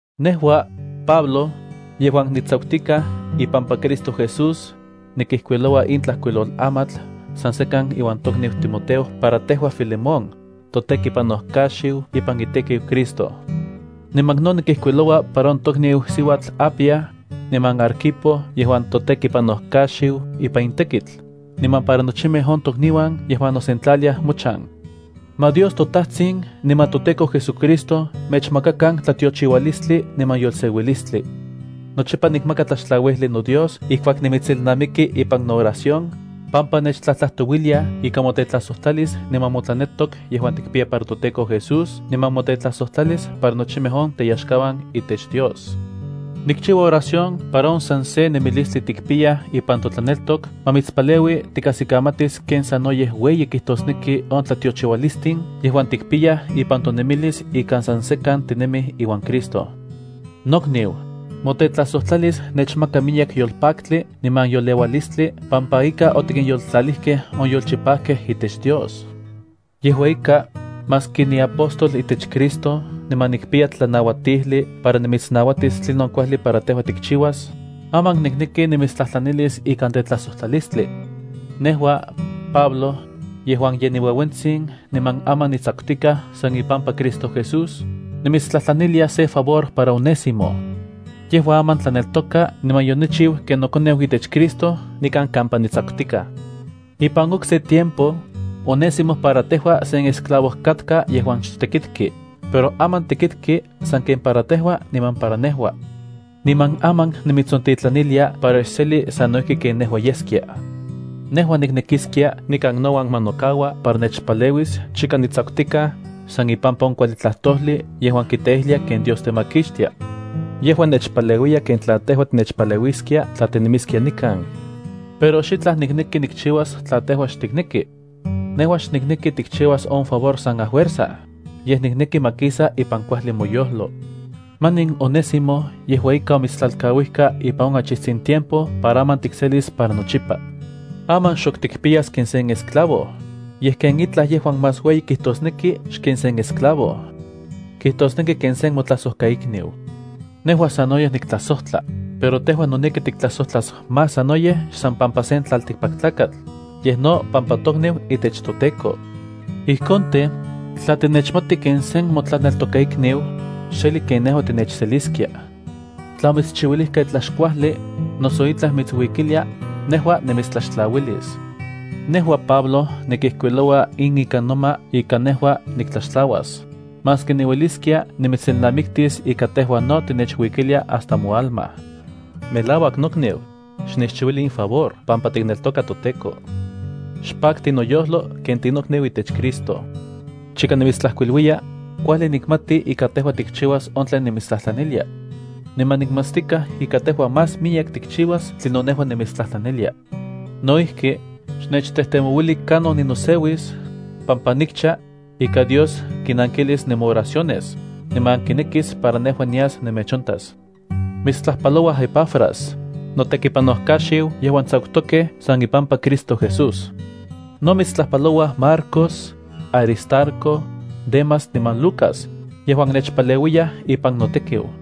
Nejua, Pablo, yejuan nitsakutikaj ipampa Cristo Jesús, nikijkuiloua in tlajkuilolamatl san sekan iuan tokniu Timoteo para tejua, Filemón, totekipanojkaxiu ipan itekiu Cristo. Niman no nikijkuiloua para on tokniu siuatl Apia, niman Arquipo yejuan totekipanojkaxiu ipan in tekitl, niman para nochimej on tokniuan yejuan nosentlaliaj mochan. Ma Dios toTajtsin niman toTEKO JesuCristo mechmakakan tlatiochiualistli niman yolseuilistli. Nochipa nikmaka tlaxtlauijli noDios ijkuak nimitselnamiki ipan nooración, pampa nechtlajtlajtouiliaj ika motetlajsojtlalis niman motlaneltok yejuan tikpiya para toTEKO Jesús niman motetlajsojtlalis para nochimej on teyaxkauan itech Dios. Nikchiua oración para on san se nemilistli tikpiyaj ipan totlaneltok ma mitspaleui tikajsikamatis ken sanoyej ueyi kijtosneki on tlatiochiualistin yejuan tikpiyaj ipan tonemilis ika san sekan tinemij iuan Cristo. Nokniu, motetlajsojtlalis nechmaka miyek yolpaktli niman yoleualistli pampa ika otikinyoltlalijkej on yolchipajkej itech Dios. Yejua ika, maski niapóstol itech Cristo niman nikpiya tlanauatijli para nimitsnauatis tlinon kuajli para tejua tikchiuas, aman nikneki nimitstlajtlanilis ikan tetlajsojtlalistli. Nejua, Pablo, yejuan ye niueuentsin niman aman nitsakutikaj san ipampa Cristo Jesús, nimitstlajtlanilia sen favor para Onésimo. Yejua aman tlanelkoka niman yonochiu ken nokoneu itech Cristo nikan kampa nitsakutikaj. Ipan okse tiempo, Onésimo para tejua sen esclavo katka yejuan xtekitki, pero aman tekitki sanken para tejua niman para nejua. Niman aman nimitsontitlanilia para xseli sano ijki ken nejua yeskia. Nejua niknekiskia nikan nouan ma nokaua para nechpaleuis chika nitsakutikaj san ipampa on kuajli tlajtojli yejuan kiteijlia ken Dios temakixtia. Yejua nechpaleuiskia ken tla tejua tinechpaleuiskia tla tinemiskia nikan. Pero xitlaj nikneki nikchiuas tla tejua xtikneki. Nejua xnikneki tikchiuas on favor san afuerza, yej nikneki ma kisa ipan kuajli moyojlo. Manin Onésimo yejua ika omitstlalkauijka ipan on achijtsin tiempo para aman tikselis para nochipa. Aman xok tikpiyas ken sen esclavo, yej ken itlaj yejuan más ueyi kijtosneki xken sen esclavo. Kijtosneki ken sen motlajsojkaikniu. Nejua sanoyej niktlajsojtla, pero tejua noneki tiktlajsojtlas más sanoyej xsan pampa sen tlaltikpaktlakatl, yej no pampa tokniu itech toTEKO. Ijkon tej, tla tinechmati ken sen motlaneltokaikniu, xseli ken nejua tinechseliskia. Tla omitschiuilijka itlaj xkuajli, noso itlaj mitsuikilia, nejua nimitstlaxtlauilis. Nejua, Pablo, nikijkuiloua in ikan noma ika nejua niktlaxtlauas, maski niueliskia nimitselnamiktis ika tejua no tinechuikilia hasta moalma. Melauak, nokniu, xnechchiuili in favor pampa tikneltoka toTEKO. Xpakti noyojlo ken tinokniu itech Cristo. Chika nimitstlajkuiluiya, kuajli nikmati ika tejua tikchiuas on tlen nimitstlajtlanilia. Niman nikmatstikaj ika tejua más miyek tikchiuas tlinon nejua nimitstlajtlanilia. No ijki, xnechtejtemouili kanon ninoseuis, pampa nikcha, ika Dios kinankilis nemooraciones, niman kinekis para nejua nias nemechontas. Mitstlajpalouaj Epafras, notekipanojkaxiu yejuan tsakutokej san ipampa Cristo Jesús. No mitstlajpalouaj Marcos, Aristarco, Demas niman Lucas, yejuan nechpaleuiyaj ipan notekiu.